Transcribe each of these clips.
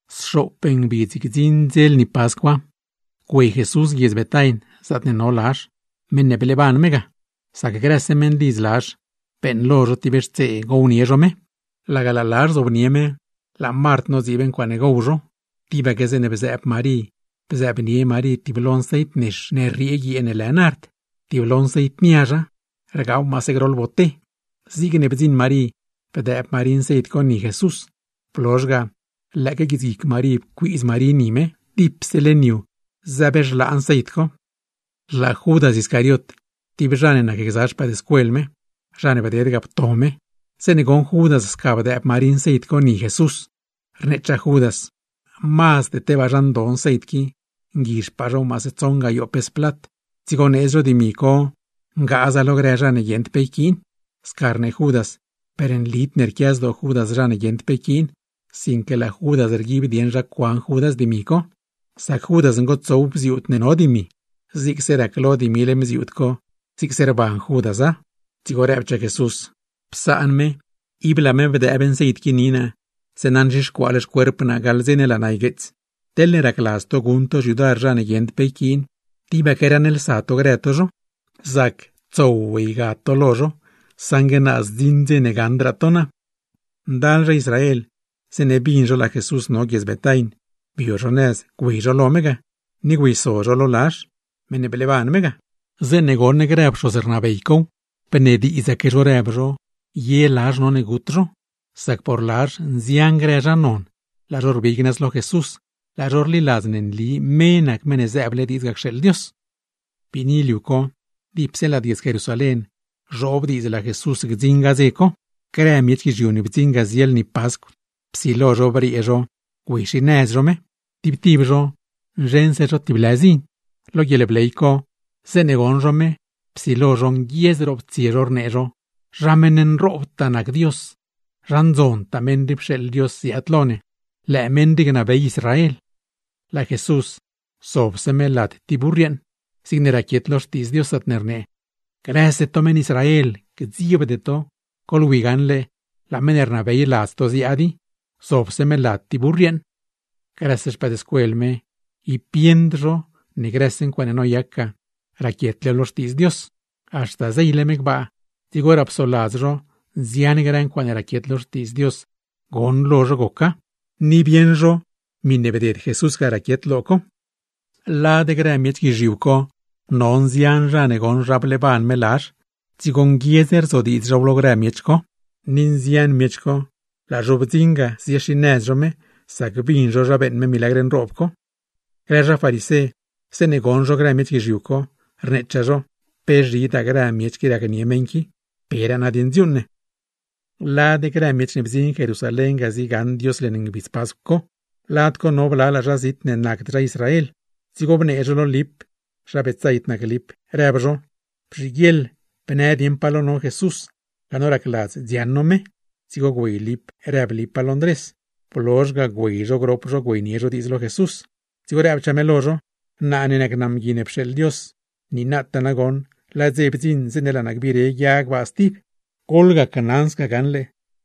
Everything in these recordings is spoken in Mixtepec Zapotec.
Sxoop ngbidz gdziṉ dze lni Pascwa, güey Jesús guiedz Betain, zaatne no Lazh, meṉ ne bleeban me ga. Sac grëse meṉlidz Lazh, beeṉlo zho tib xtsee, gownie zho me. Mezh no zho, laga laa Lazh zobnie me, laa Mart nodziib ncuaaṉe gowxtsee zho lo mezh, tibaque zeeṉe bzëëb Marí bzëëbnie Marí tib lo nceit nex ne rriee guiee ne lë nard, tib lo nceit niazha, rgaaw maase groḻ boté. Zigne bdziṉ Marí bdëëb Marí nceit co ni Jesús, blozh ga con guitsguic Marí pcuiidz Marí ni me. Dipse leṉ yu zëbxlaa nceit co. Laa Judas Iscariot, tib zha ne nacgza no (zha ne bded ga pto me) zeeṉe goṉ Judas sca bdëëb Marí nceit co ni Jesús, rneechaa Judas: ―Mazd tebaa zha ndo nceit qui. Nguizhpaa zhow maase tsoṉ gayoo pes plat, dzigo needz zho dimi co ngaaza lo grë zha mban ne guieṉd pe yquiin. Sca rnee Judas, per nlid ne rquia zdoo Judas zha ne guieṉd pe yquiin, sinque laa Judas rguib dieṉ zha cuan Judas dimi co, sac Judas ngotsow bziuud ne no dimi; zigse raclo dimi leṉ bziuud co, zhliaanse rbee Judas dimi co. Dzigo rëbchaa Jesús: ―Psaan me. Ib laa me bdëëb nceit qui ni naa, zeeṉa nzhixcuaale xcuerp naa gaḻ dze ne laa naa ygueets. Teḻne racladz to guṉ to xyudar zha ne guieṉd pe yquiin, tibaque raṉlsa to grë to zho, zac tsow ygad to lo zho; saṉgue naa zdziṉ dze gaṉdraa to naa. Ndal grë zha Israel, zeeṉe bin zho laa Jesús no guiedz Betain, bio zho nëz güey zho lo me ga, ni güeyso zho lo Lazh, meṉ ne bleeban me ga. Zeeṉe goṉ grë pxoz rnabey cow, nacne bnediidzaque zho ye Lazh none gut zho; sac por Lazh, nzian grë zha non, laa zho rbig nëz lo Jesús, laa zho rliladz ne nli me nac Meṉ ne zëëble diidz ga cxeeḻ Dios. Biini liu co, dipse lad guiedz Jerusalén zhoob diidz laa Jesús gdziṉ ga dze co. Grë miech guizhiu ne bdziṉ ga zie lni Pascw, psilo zho briee zho ziaad-xinëz zho me; tib tib zho nzheṉse zho tib lë zin. Lo guieḻbley co, zeeṉe goṉ zho me, psilo zho nguiedz roptsie zho, rnee zho: ―¡Zha meṉ nroobtaa nac Dios! ¡Zha ndzontaa meṉ rii pxeeḻ Dios ziaad lo ne! ¡Lëë meṉ rii gnabey Israel! Laa Jesús, zobse me lad tib burr yeeṉ, zigne raquiet lo Xtiidz Dios zaatne rnee: Grëse to meṉ Israel, gdziebde to. ¡Goḻwi gaṉle, laa meṉ ne rnabey ladz to ziaad i, zobse me lad tib burr yeeṉ! Grëse no ne nac no xpëëdscuel me, ni tib no bieṉd hor co ne grëse ncuaaṉe noyac ga, raquietlew lo Xtiidz Dios; sinque haxta zeyle me gbaa, dzigoraa psoladz no nzian grë ncuaaṉe raquiet lo Xtiidz Dios ga, goṉlo no goca; ni bieṉ no Jesús raquiet ga. Lad grë miech guizhiu co no nzian zha ne goṉ zha bleeban me Lazh, dzigo nguiedz rzodiidz zhow lo grë miech co. Ni nzian grë miech co, laa zho blanso ga ziaad-xinëz zho me, sac bin zho zha beeṉ me milagr nroob co. Grë zha farisé, zeeṉe goṉ zho grë miech guizhiu co, rneechaa zho: ―¡Pe zhidaa grë miech qui racnie meṉ qui! ¡Peraa nadieṉ dziuuṉ ne! Lad grë miech ne bdziṉ Jerusalén ga, ziegaṉ Dios leṉ ngbidz Pascw co, lad co no blalaa zha zit ne nacd zha Israel, dzigo bnee zho lo Lip (zha Betsaid nac Lip) rëb zho: ―Bzhiguieḻ bnë dieṉ pa lo no Jesús, laa no racladz dziaṉ no me. Dzigo güey Lip rëb Lipa lo Ndrés, blozh ga güey zho grop zho güeynie zho diidz lo Jesús. Dzigo rëbchaa me lo zho: ―Naa ne nac naa Mgui ne pxeeḻ Dios, niinataa nagoṉ laa dze bdziṉ zeeṉe laa naa gbire guia gbaa stib. Goḻquiaadiaga gaṉle: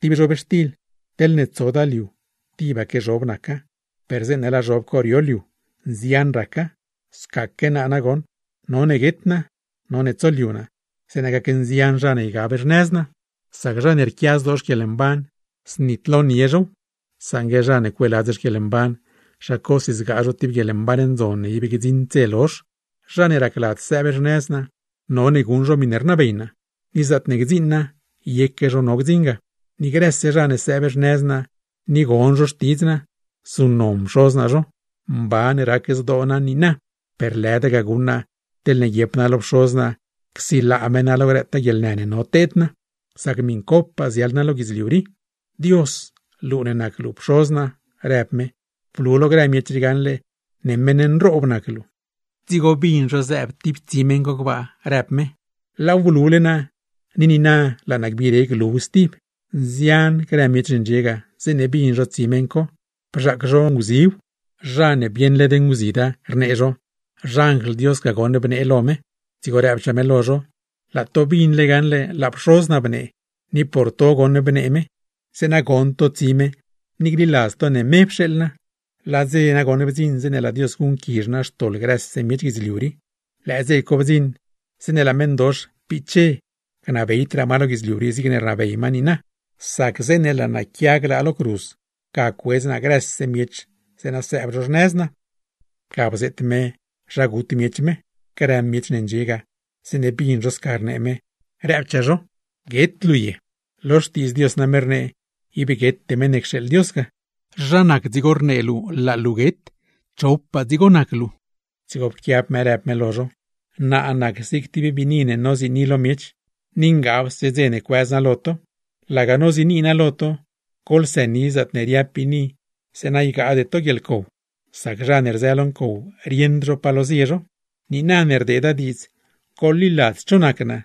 Tib zhobxtil, teḻne tsoda liu tibaque zhob naca; per zeeṉe laa zhob co rio liu, nzian raca. Scaque naa nagoṉ, none guet naa, none tsoliu naa, zeeṉa gacnzian zha ne ygab xnëz naa. Sac zha ne rquia zdoo xquieḻmban, znitlonie zhow; saṉgue zha ne cueeladz xquieḻmban, zha cosi zgaa zho tib guieḻmban ndzon ne ib gdziṉd dze lozh. Zha ne racladz sëëb xnëz naa, none guṉ zho miṉe rnabey naa; ni zaatne gdziṉ naa yeque zho no gdziṉ ga. Ni grëse zha ne sëëb xnëz naa ni gon zho xtidz naa, zuṉnon Pxoz naa zho. Mban rac zdoo naa niina. Per lëda ga guṉ naa, teḻne guiep naa lo Pxoz naa csilaa me naa lo grëtaa guieḻnë ne no teed naa. ¡Sac par miṉcopaa ziaḻ naa lo guidzliu rii! ’Dios, luu ne nac luu Pxoz naa ―rëb me―. Blu lo grë miech rii gaṉle ne meṉ nroob nac luu. Dzigo bin zho zëëb tib tsi meṉ co gbaa, rëb me: ―Laaw blule naa, ni niina laa naa gbire gluw stib. Nzian grë miech ne ndxie ga, zeeṉe bin zho tsi meṉ co, bzhaac zho nguziw; zha ne bieṉ led nguzida, rnee zho: ―Xanjl Dios ga goṉ bnee lo me. Dzigo rëbchaa me lo zho: ―Laa to bin gaṉle laa Pxoz naa bnee, ni por to goṉ bnee me, zeeṉa gon to tsi me ni gliladz to ne me pxeeḻ naa. Laa dze nagoṉ bdziṉ zeeṉe laa Dios guṉquizh naa xtoḻ grëse miech guidzliu rii; lëë dze bdziṉ zeeṉe laa meṉdox piche gnabeydraa ma lo guidzliu rii zigne rnabey ma niina. Sac zeeṉe laa naa quia glaa lo cruz, ga cuedz naa grëse miech zeeṉa sëëb zho xnëz naa. Ga bzeet me zha gut miech me. Grë miech ne ndxie ga, zeeṉe bin zho sca rëb me, rëbchaa zho: ―¿Guet luu ye? Lo Xtiidz Dios name rnee, ib guete Meṉ ne cxeeḻ Dios ga. ¿Zha nac dzigo ne rnee luu laa luu guet? ¿Chopaa dzigo nac luu? Dzigo pquiab me rëb me lo zho: ―Naa nac zig tib biini ne noziini lo miech; ni ngabse dze ne cuëz naa lo to. Laga noziini naa lo to, goḻsëni zaatne riab biini zeeṉa ygaade to guieḻcow; sac zha ne rzë lo ncow rieṉd zho palo zie zho. Niina ne rdeeda diidz goḻliladz cho nac naa,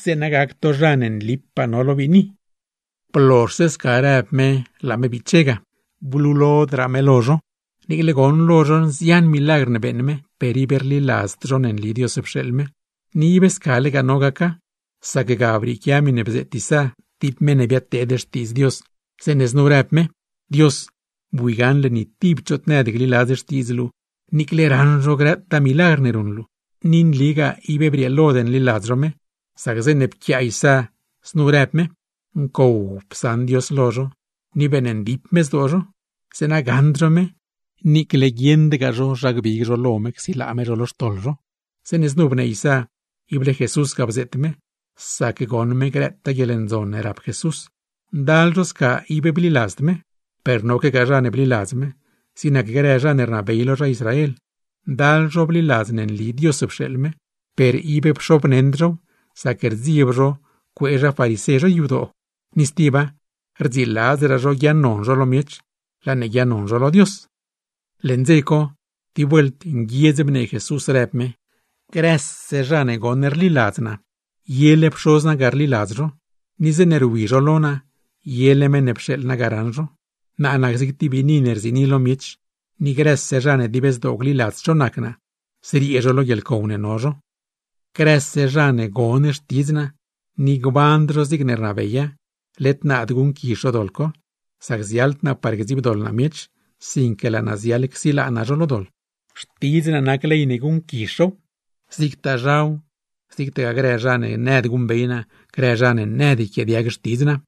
zeeṉa gac to zha ne nlipaa no lo biini. Blozhse sca rëb me laa me biche ga, blulodraa me lo zho. Niicle goṉlo zho nzian milagr ne beeṉ me, per ib rliladzd zho ne nli Dios pxeeḻ me. Ni ib scalegaa no gaca, sac ga brieequia miṉe bzeet Isá (tib meṉ ne biadteed xtiidz Dios) zeeṉe znu rëb me: Dios, bui gaṉle ni tib choot nëd gliladz xtiidz luu, niicle raṉ zho grëtaa milagr ne ruṉ luu. Ni nligaa ib brieelod nliladz zho me; sac zeeṉe pquiaa Isá, znu rëb me: Ncow psaṉ Dios lo zho, ni beeṉndip me zdoo zho; zeeṉa gaṉd zho me, niicle guieṉdgaa zho zha gbig zho lo me csilaa me zho lo xtoḻ zho. Zeeṉe znu bnee Isá, ible Jesús ga bzeet me; sac goṉ me grëtaa guieḻndzon ne rap Jesús. Ndal zho sca ib bliladzd me, per noquegaa zha ne bliladz me; zig nac grë zha ne rnabey lo zha Israel, ndal zho bliladz ne nli Dios pxeeḻ me, per ib pxobneṉd zhow; sac rdzieb zho cuee zha farisé zho yadoo. ¡Ni stiba rdziladzraa zho guiaaṉnon zho lo miech, laa ne guiaaṉnon zho lo Dios! Leṉ dze co, tib vuelt nguiedz bnee Jesús, rëb me: ―¡Grëse zha ne rliladz naa, yele Pxoz naa ga rliladz zho! ¡Ni zeeṉe rwi zho lo naa, yele meṉ ne pxeeḻ naa ga raṉ zho! Naa nac zig tib biini ne rziini lo miech, ni grëse zha ne dib zdoo gliladz cho nac naa, zriee zho lo guieḻcow ne no zho. Grëse zha ne gon Xtidz naa, ni gband zho zigne rnabeya, led naad guṉquizh zho doḻ co; sac ziaḻd naa par gdziibdoḻ naa miech, sinque laa naa ziaḻ par csilaa naa zho lo doḻ. Xtidz naa gac ley ne guṉquizh zhow; zigtaa zhaw zigtagaa grë zha ne nëd guṉbey naa, grë zha ne nëd yquiaadiag xtidz naa.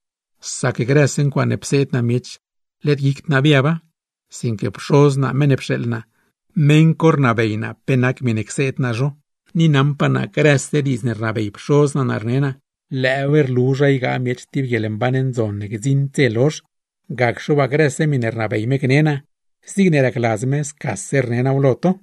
Sac grëse ncuaaṉe pseed naa miech, led guicd naa biaba, sinque Pxoz naa meṉ ne pxeeḻ naa, meṉ co rnabey naa pe nac miṉe cseed naa zho. Ni naṉpaa naa, grëse diidz ne rnabey Pxoz naa naa rne naa, lëëw rlu zha ygaa miech tib guieḻmban ndzon ne gdziṉd dze lozh; gacxe waa, grëse miṉe rnabey me gne naa, zigne racladz me scase rne naaw lo to.